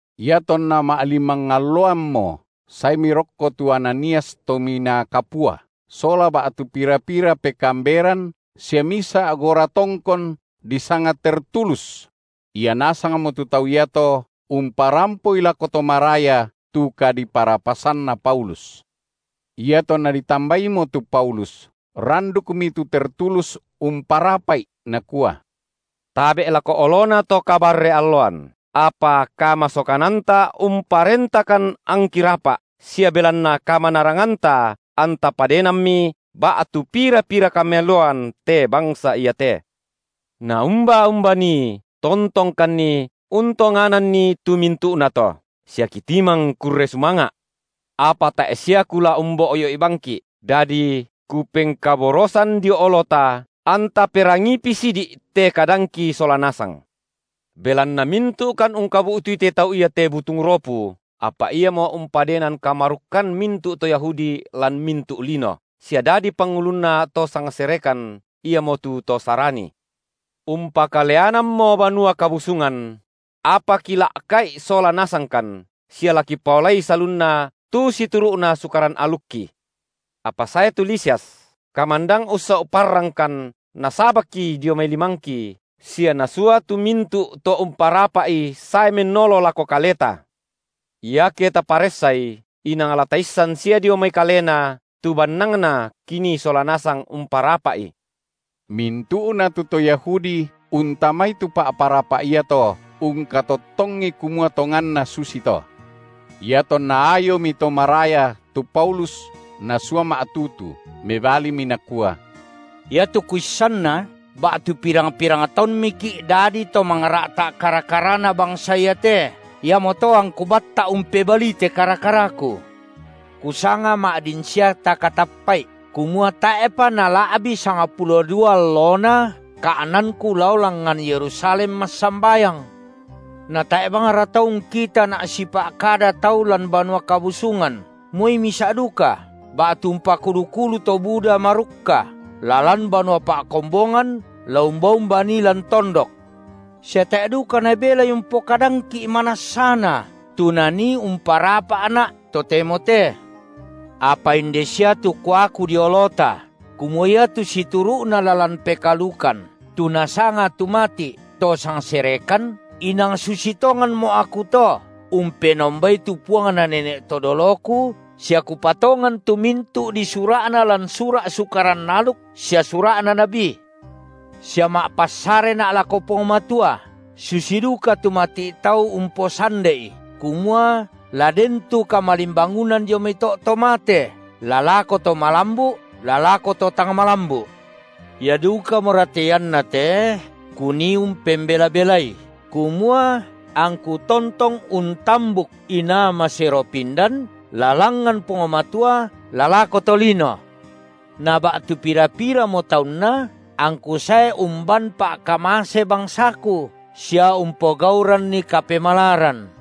Iatonna ma’limang alloammo saemi rokko tu Ananias Tominaa Kapua, sola ba’tu pira-pira pekaamberan sia misa’ goratongkon disanga Tertulus; ia nasangmo tu tau iato umparampoi lako to maraya tu kadiparapasanna Paulus. Iatonna ditambaimo tu Paulus, randukmi tu Tertulus umparapa’i, nakua: Tabe’ lako olona to kabarre-alloan, apa kamasokananta unparentakan angki rapa’, sia belanna kamanaranganta anta padenammi ba’tu pira-pira kameloan te bangsa iate. Naumba-umba nii tontongkanni untongananni tu mintu’nato, sia kitimang kurre sumanga’. Apa tae’ sia kula umboyo’i bangki’, dadi kupengkaborosan dio olota, anta perangiipi sidi’ te kadangki sola nasang. Belanna mintu’kan ungkabu’tui te tau iate butung ropu, apa iamo umpadenan kamarukkan mintu’ to Yahudi lan mintu’ lino, sia dadi pangulunna to sangserekan, iamotu to Sarani. Umpakaleanammo Banua Kabusungan; apa kila’ka’i sola nasangkan, sia la kipaolai salunna tu situru’na Sukaran alukki. Apa sae tu Lisias, kamandang ussau’ parrangkan nasabakki dio mai limangki, sia nasua tu mintu’ to umparapa’i sae mennolo lako kaleta; iake taparessai, inang la taissan sia dio mai kalena tu bannangna kinii sola nasang umparapa’i. Mintu’na tu to Yahudi, untamai tu pa’parapa’ iato, ungkatottongi kamua tonganna susito. Iatonna ayomi to maraya tu Paulus nasua ma’tutu, mebalimi nakua: Iatu kuissanna ba’tu pirang-pirang taunmiki’ dadi to mangra’ta’ kara-karana bangsa iate iamoto angku batta’ umpebalii te kara-karaku. Kusanga ma’din sia takatappa’i, kumua tae’pa nala’bi sangpulo dua allona ka’nanku lao langngan Yerusalem massambayang. Natae’ bangra tau ungkitana’ sipa’kada tau lan Banua Kabusungan moi misa’ duka, ba’tu umpakulu-kulu to buda marukka, la lan banua pa’kombongan la umba-umba nii lan tondok. Sia tae’ duka nabelai umpokadangki’ manassana tu nanii umparapa’na’ totemo te. Apa inde sia tu kuaku dio olota kumua iatu situru’na lalan pekaalukan tu nasanga tu mati’ to sangserekan, inang susi tonganmo’ aku to umpenombai tu Puangna nene’ to doloku, sia kupatongan tu mintu’ disura’na lan sura’ Sukaran aluk sia sura’na nabi. Sia ma’passarena’ lako Puang Matua, susi duka tu mati’ tau umposande’i kumua la den tu kamalimbangunan dio mai to’ to mate la lako to malambu’ la lako to tang malambu’. Ia dukamora te ianna te kunii umpembela-belai, kumua angku tontong untambuk inaa masero pindan la langngan Puang Matua la lako tolino. Na ba’tu pira-piramo taunna angku sae umban pa’kamase bangsaku sia umpogauranni kapemalaran.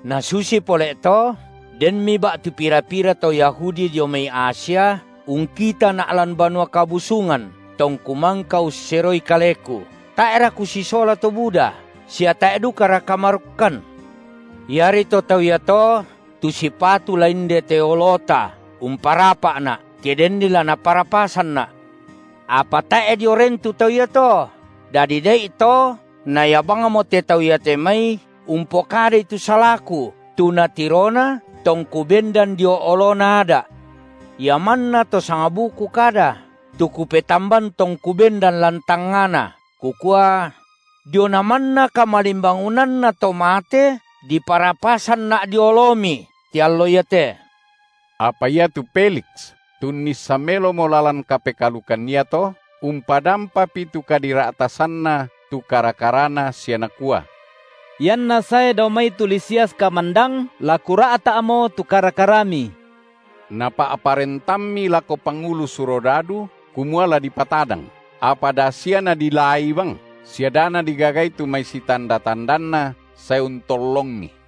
Nasusi pole’ to denmi ba’tu pira-pira to Yahudi dio mai Asia ungkitana’ lan Banua Kabusungan tongku mangka usseroi kaleku, tae’ra kusisola to buda, sia tae’ dukara kamarukkan; iari to tau iato tu sipatu la indete olota umparapa’na, ke denni la naparapasanna’. Apa tae’ dio ren tu tau iato, dadi da’ito na ia bangmo te tau iate mai umpokadai tu salaku tu natirona tongku bendan dio olona Ada’, ia manna to sangbuku kada, tu kupetamban tongku bendan lan tangngana kukua: Diona manna kamalimbangunanna to mate diparapasanna’ dio olomi te allo iate. Apa iatu Feliks, tu unnissan melomo lalan kapekaalukan iato, umpadampapi tu kadira’tasanna tu kara-karana sia nakua: Ianna sae dao mai tu Lisias kamandang, la kura’ta’mo tu kara-karami. Napa’parentammi lako pangulu surodadu kumua la dipatadang, apa da sia nadilaai bang, sia da nadigagai tu mai sitanda-tandanna sae untollongi.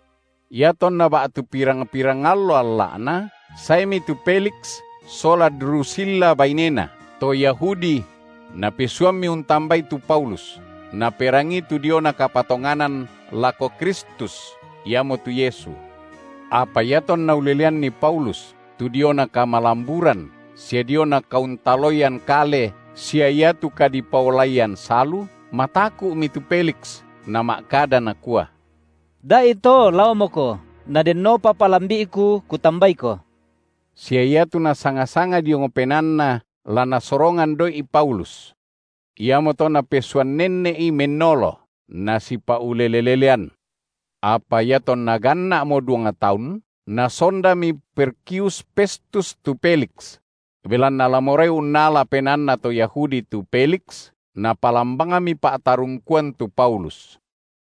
Iatonna ba’tu pirang-pirang allo alla’na, saemi tu Feliks sola Drusilla bainena, tu Yahudi; napesuammi untambai to Paulus, naperangii tu diona kapatonganan lako Kristus, iamotu Yesu. Apa iatonna uleleanni Paulus tu diona kamalamburan sia diona kauntaloian kale sia iatu kadipaolaian salu, mataku’mi tu Feliks, nama’kada nakua: Da’ito laomoko, nadennopa palambi’ku kutambaiko. Sia iatu nasanga-sanga diong penaanna la nasorongan doi’ Paulus. Iamoto napesuan nenne’i mennolo, nasipa’ulele-lelean. Apa, iatonna ganna’mo duang taun, nasondami Perkius Festus tu Feliks: belanna la morai unnala penaanna to Yahudi tu Feliks, napalan bangmi pa’tarungkuan tu Paulus.